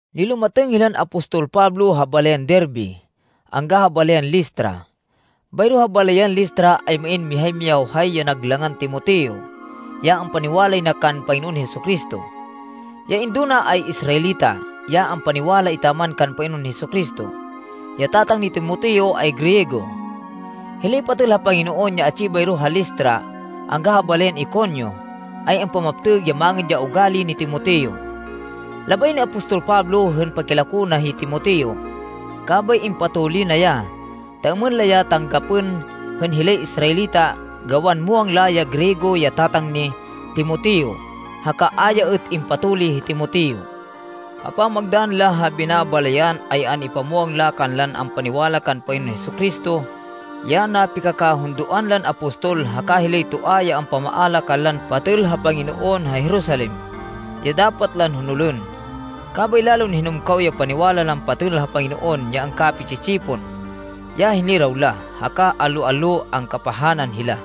Nilumatêng hilan apostol Pablo ha balayan Derbe angga ha balayan Listra. Bayro ha balayan Listra ay main mihay miyawhay ya nag langan Timoteo, ya ampaniwalay na kan Panginoon Jesu-Cristo. Ya indo na ay Israelita, ya ampaniwala etaman kan Panginoon Jesu-Cristo. Ya tatang ni Timoteo ay Griego. Hilay patêl ha Panginoon ya atsi bayro ha Listra angga ha balayan Iconio ay ampamaptêg ya mangêd ya ugali ni Timoteo. Labay ni apostol Pablo hên pakilako na hi Timoteo, kabay impatuli na ya ta êmên la ya tanggapên hên hilay Israelita, gawan muwang la ya Griego ya tatang ni Timoteo, haka a ya êt impatuli hi Timoteo. Ha pamagdann la ha binabalayan ay an-ipamwang la kanlan ampaniwala kan Panginoon Jesu-Cristo, ya napikakahundoan lan apostol haka hilay toa ya ampamaala kanlan patêl ha Panginoon ha Jerusalem, ya dapat lan honolên. Kabay lalon hinumkaw ya paniwala lan patêl ha Panginoon ya angkapi-tsi-tsipon, ya hiniraw la, haka allo-allo angkapahanan hila.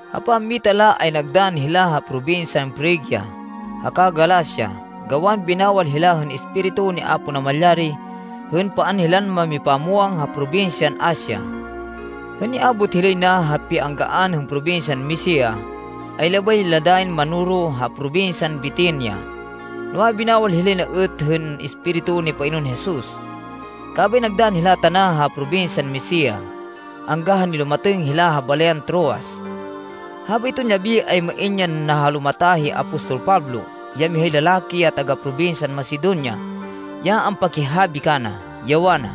Ha pammita la ay nagdann hila ha probinsyan Frigia haka Galacia gawan binawal hila hên Espiritu ni Apo Namalyari hên paan hilan mamipamwang ha probinsyan Asia. Hên niabot hilay na ha pianggaan hên probinsyan Misia, ay labay la dayin manoro ha probinsyan Bitinia, noa, binawal hilay na êt hên Espiritu ni Panginoon Jesus. Kabay nagdann hila tana ha probinsyan Misia angga ha nilumatêng hila ha balayan Troas. Habayton yabi, ay main yan nahalumata hi apostol Pablo ya mihay lalaki ya taga-probinsyan Macedonia ya ampakihabi kana, ya wana,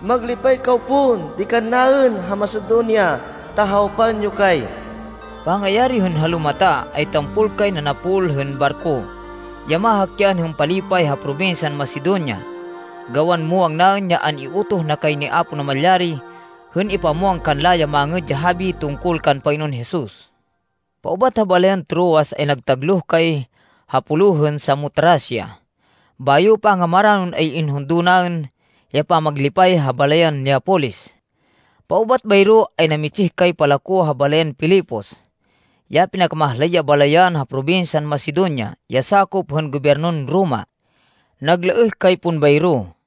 “Maglipay kaw pon di kannaên ha Macedonia ta hawpan yo kay!” Pangayari hên halumata, ay tampol kay nanapol hên barko ya mahakyan hên palipay ha probinsyan Macedonia gawan muwang naên ya an-iutoh na kay ni Apo Namalyari hên ipamwang kanla ya Mangêd ya Habi tungkol kan Panginoon Jesus. Paubat ha balayan Troas ay nagtagloh kay ha pulo hên Samotracia. Bayo, pangamaranon ay inhundo naên ya pamaglipay ha balayan Neapolis. Paubat bayro ay namitsih kay palako ha balayan Filipos ya pinakamahlay ya balayan ha probinsyan Macedonia ya sakop hên gobyernon Roma. Naglaêh kay pon bayro.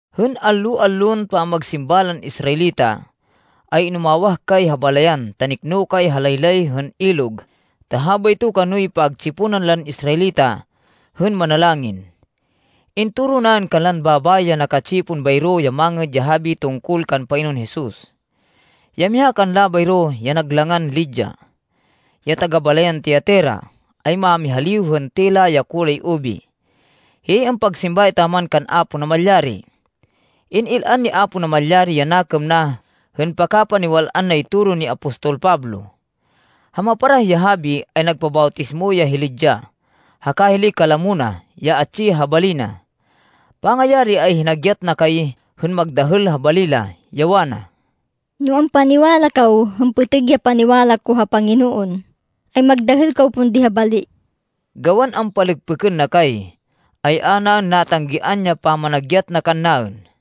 Hên allo-allon pamagsimba lan Israelita, ay inumawah kay ha balayan, ta nikno kay ha laylay hên ilog ta habayto kanoy pagtsiponan lan Israelita hên manalangin. Intoro naên kanlan babayi ya naka-tsipon bayro ya Mangêd ya Habi tungkol kan Panginoon Jesus. Ya miha kanla bayro, ya nag langan Lydia, ya taga-balayan Tiatira, ay mámihaliw hên tela ya kulay ubi. Hiyay ampagsimba etaman kan Apo Namalyari. In-il-an ni Apo Namalyari ya nakêm na hên pakapaniwal-an nay toro ni apostol Pablo. Ha maparah ya habi ay nagpabawtismo ya hi Lydia haka hilay kalamo na ya atsi ha bali na. Pangayari ay hinagyat na kay hên magdahêl ha bali la, ya wana, “No ampaniwala kaw hên pêtêg ya paniwala ko ha Panginoon, ay magdahêl kaw pon di ha bali.” Gawan ampalêkpêkên na kay, ay a naên natanggian ya pamanagyat na kannaên.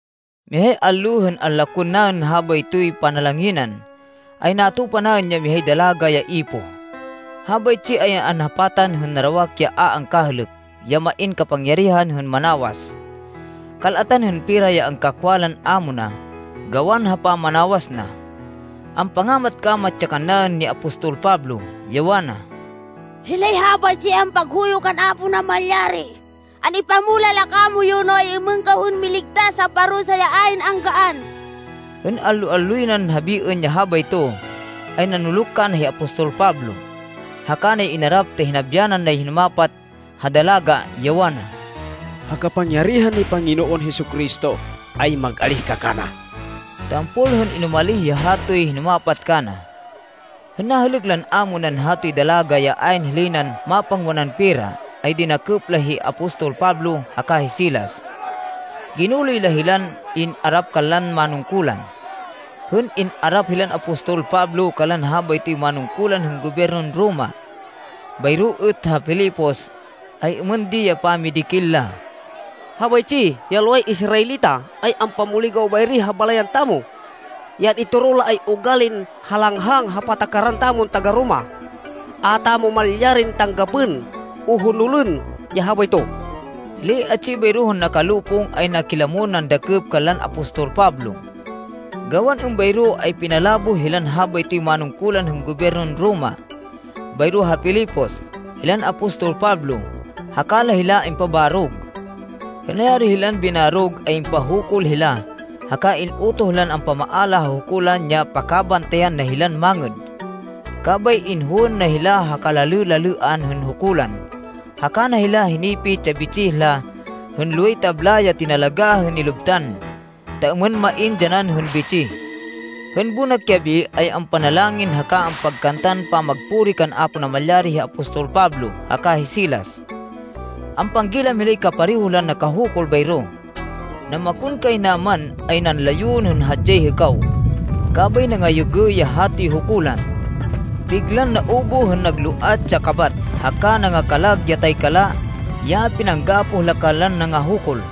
Mihay allo hên anlakwên naên habaytoy panalanginan, ay natupa naên ya mihay dalaga ya ipoh. Habaytsi ay anhapatan hên narawak ya a angkahêlêk ya main kapangyarihan hên manawas. Kal-atan hên pera ya angkakwa lan ámo na gawan ha pamanawas na. Ampangamat-kamat ya kannaên ni apostol Pablo, ya wana, “Hilay habaytsi ay ampaghuyo kan Apo Namalyari. An-ipamulah la kamoyu no ay-êmên kaw hên miligtas ha parusa ya ayn anggaan.” Hên allo-alloy nan habiên ya habayto, ay nanuluk kana hi apostol Pablo, haka na ya inarap ta hinabyanan nay hinumapat ha dalaga, ya wana, “Ha kapangyarihan ni Panginoon Jesu-Cristo, ay mag-alíh ka kana.” Tampol hên inumalih ya hatoy hinumapat kana. Hên nahêlêk lan ámo nan hatoy dalaga ya ayn hilay nan mapangwanan pera, ay dinakêp la hi apostol Pablo haka hi Silas. Ginuloy la hilan in-arap kanlan manungkulan. Hên in-arap hilan apostol Pablo kanlan habaytoy manungkulan hên gobyernon Roma, bayro êt ha Filipos, ay êmên di ya pamidikil la: “Habaytsi ya loway Israelita ay ampamuligaw bayri ha balayan tamo. Ya an-itoro la ay ugalin halanghang ha patakaran tamon taga-Roma. A tamo malyarin tanggapên o honolên ya habayto.” Hilay atsi bayro hên nakalopong, ay nakilamon nandakêp kanlan apostol Pablo. Gawan êmbayro, ay pinaláboh hilan habaytoy manungkulan hên gobyernon Roma bayro ha Filipos hilan apostol Pablo, haka la hila impabarog. Hên nayari hilan binarog, ay impahukul hila haka in-utoh lan ampamaala ha hukulan ya pakabantayan na hilan mangêd. Kabay inhowên na hila ha kalalê-lalêan hên hukulan, haka na hila hinipit ya bitsih la hên loway tabla ya tinalagá hên nilubtan ta êmên main dyanan hên bitsih. Hên bonak yabi, ay ampanalangin haka ampagkantan pamagpuri kan Apo Namalyari hi apostol Pablo haka hi Silas. Ampanggilam hilay kapareho lan nakahukul bayro. Namakonkaynaman, ay nanlayon hên hadyay hêkaw. Kabay nangayêgê ya hatoy hukulan. Biglan naubuh hên nangaloat ya kabat, haka nangakalag ya taykala ya pinanggapoh la kanlan nangahukul.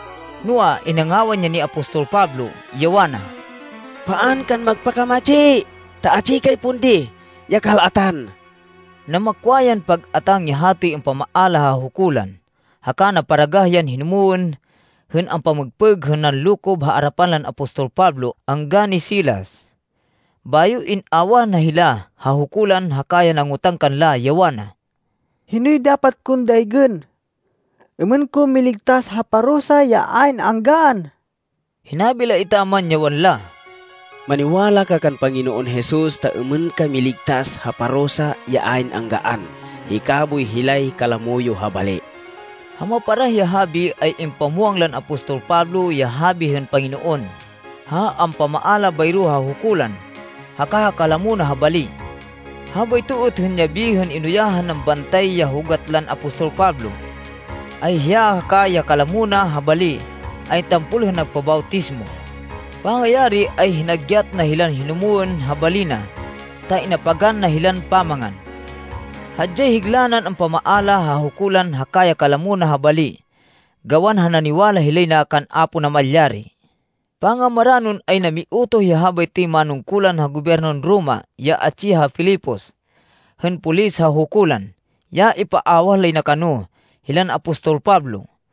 Noa, inangawan ya ni apostol Pablo, ya wana, “Paan kan magpakamatsi ta atsi kay pon di ya kal-atan!” Namakwa yan pag-atáng ya hatoy ampamaala ha hukulan, haka naparagah yan hinumwên hên ampamêgpêg hên nanlokob ha arapan lan apostol Pablo angga ni Silas. Bayo in-awah na hila ha hukulan haka ya nangotang kanla, ya wana, “Hinoy dapat kon daygên êmên ko miligtas ha parusa ya ayn anggaan?” Hinabi la etaman, ya wanla, “Maniwala ka kan Panginoon Jesus ta êmên ka miligtas ha parusa ya ayn anggaan, hika boy hilay kalamo yo ha bali.” Ha maparah ya habi ay impamwang lan apostol Pablo ya habi hên Panginoon ha ampamaala bayro ha hukulan haka ha kalamo na ha bali. Habayto êt hên yabi hên inuyahan nan bantay ya hugat lan apostol Pablo, ay hiya haka ya kalamo na ha bali ay tampol hên nagpabawtismo. Pangayari ay hinagyat na hilan humwên ha bali na ta inapagan na hilan pamangan. Hadyay higla nan ampamaala ha hukulan haka ya kalamo na ha bali gawan ha naniwala hilay na kan Apo Namalyari. Pangamaranon, ay namiutoh ya habaytoy manungkulan hên gobyernon Roma ya atsi ha Filipos, hên polis ha hukulan, ya ipaawah lay na kano, hilan apostol Pablo.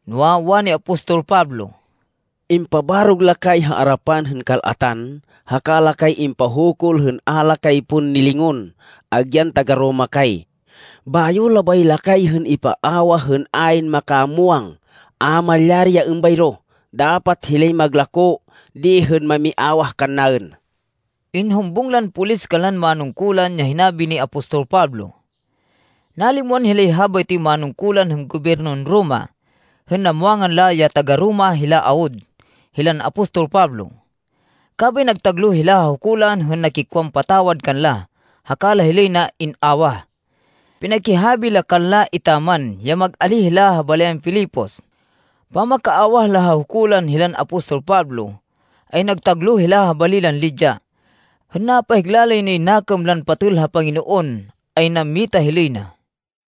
Noa, wani apostol Pablo, “Impabarog la kay ha arapan hên kal-atan, haka la kay impahukul hên a la kay pon nilingon agyan taga-Roma kay! Bayo labay la kay hên ipaawah hên ayn makamwang! A malyari ya êmbayro! Dapat hilay maglakó di hên mamiawah kannaên!” Inhumbung lan polis kanlan manungkulan ya hinabi ni apostol Pablo. Nalimwan hilay habaytoy manungkulan hên gobyernon Roma hên namwangan la ya taga-Roma hila awud hilan apostol Pablo. Kabay nagtagloh hila ha hukulan hên nakikwan patawad kanla haka la hilay na in-awah. Pinakihabi la kanla etaman ya mag-alíh hila ha balayan Filipos. Pamakaawah la ha hukulan hilan apostol Pablo, ay nagtagloh hila ha bali lan Lydia. Hên napahigla lay nay nakêm lan patêl ha Panginoon, ay nammita hilay na.